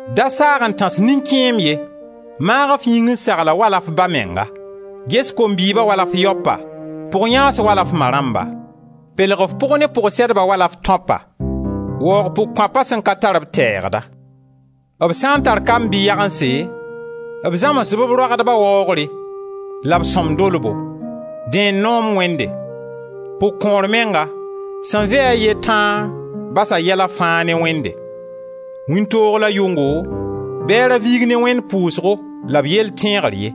Da saag n tãs nin-kẽem ye, maag f yĩng n sagl-a wala f ba menga; ges kom-bɩɩba wala f yaopa, pʋg-yãans wala f ma rãmba; pelg f pʋg ne pʋg-sɛdba wala f tãopa. Waoog pʋg-kõapa sẽn ka tar-b teegda. B sã n tar kamb bɩ yagense, b zãms-b b roagdba waoogre, la b sõm dolbo. Dẽ n noom Wẽnde. Pʋg-kõor menga, sẽn vɩ-a a ye tãa, basa yɛla fãa ne Wẽnde; wĩntoog la yʋngo bɩ a ra viig ne Wẽnd pʋʋsgo la b yell tẽegr ye.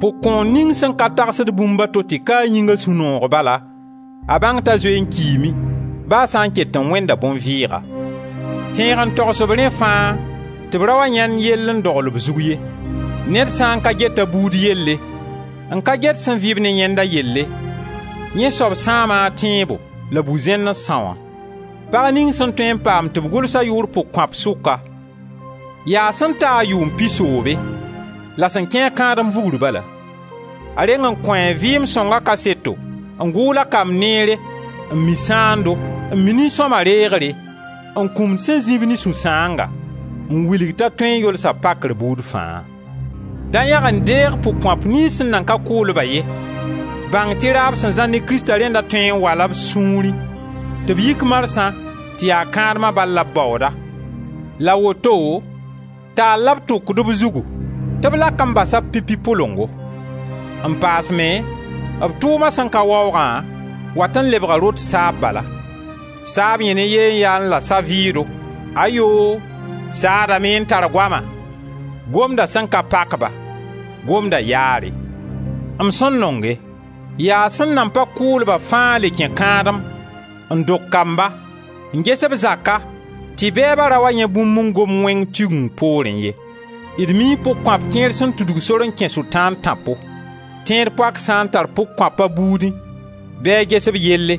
Pʋg-kõor ning sẽn ka tagsd bũmb a to tɩ ka a yĩnga sũ-noog bala, a bãng t'a zoe n kiime, ba a sã n ket n wẽnda bõn-vɩɩga. Tẽeg n togs-b rẽ fãa tɩ b ra wa yãend yell n dogl b zug ye. Ned sã n ka get a buud yelle, n ka get sẽn vɩ-b ne yẽnda yelle, yẽ soab sãama a tẽebo la bu-zẽnd n são-a. Pag ning sẽn tõe n paam tɩ b gʋls a yʋʋr pʋg-kõap sʋka, yaa sẽn taa yʋʋm pisoobe, la sẽn kẽ-a kãadem vugr bala. A reng n kõ a vɩɩm sõnga kaseto n gʋʋl a kamb neere, n mi sãando, n mi nin-sõma reegre, n kũmd sẽn zĩ-b ne sũ-sãanga, n wilg t'a tõe n yolsa pakr buud fã. Da yãg n deeg pʋg-kõap niyns sẽn nan ka kʋʋl-ba ye. Bãng tɩ raab sẽn zãr ne Krista rẽnda tõe n wala b sũurẽ tɩ b yik marsã tɩ yaa kãadma bal la b baooda, la woto taal la b tʋkd b zugu tɩ b lak n basa b pipi pʋlengo. N paas me, b tʋʋma sẽn ka waoogã, wat n lebga rot saab bala. Saab yẽnẽ yee n yaẽ la sa-vɩʋʋdo, ayoo! Saadame n tar goama; gomda sẽn ka pak-ba, gomda yaare. M sẽn nonge: yaa sẽn nan pa kʋʋl-ba fãa le kẽ kãadem, n dog kamba, n ges b zaka tɩ bɛɛba ra wa yãe bũmb n gom wẽng Tigeng poorẽ ye. D mii pʋg-kõap kẽer sẽn tudg sor n kẽ Sʋtãan tãpo. Tẽed-poak sã n tar pʋg-kõap a buudẽ bɩ a ges b yelle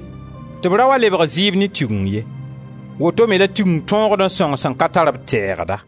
tɩ b ra wa lebg zɩɩb ne Tigeng ye. Woto me la Tigeng tõogd n sõng sẽn ka tar-b teegda.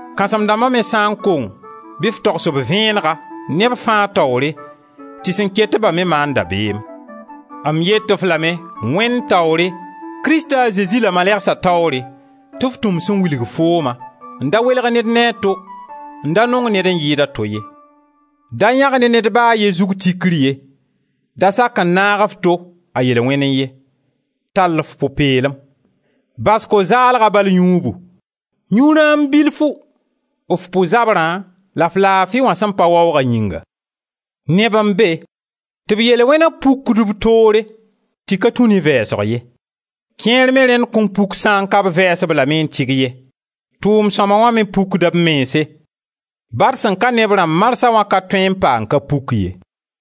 Kãsem-dãmba me sã n kong bɩ f togs b vẽenega, neb fãa taoore, tɩ sẽn ket-ba me maan dabeem. M yet-f lame, Wẽnd taoore, Krista a Zezi la malɛgsa taoore, tɩ f tũ m sẽn wilg fooma n da welg ned ne a to, n da nong ned n yɩɩd a to ye. Da yãg ne ned ba a ye zug tikr ye; da sak n naag f to a yel-wẽnnẽ ye. Tall f pʋ-peelem. Bas ko-zaalga bal yũubu. Yũ rãam bilfu, f pʋ zabrã la f laafi wã sẽn pa waooga yĩnga. Neb n be tɩ b yel-wẽna pukd b toore tɩ ka tũ ne vɛɛsg ye; kẽer me rẽnd kõn puk sã n ka b vɛɛs-b lame n tɩg ye. Tʋʋm-sõma wã me pukda b mense; ba d sẽn ka ne b rãmb marsã wã ka tõe n pa n ka puk ye.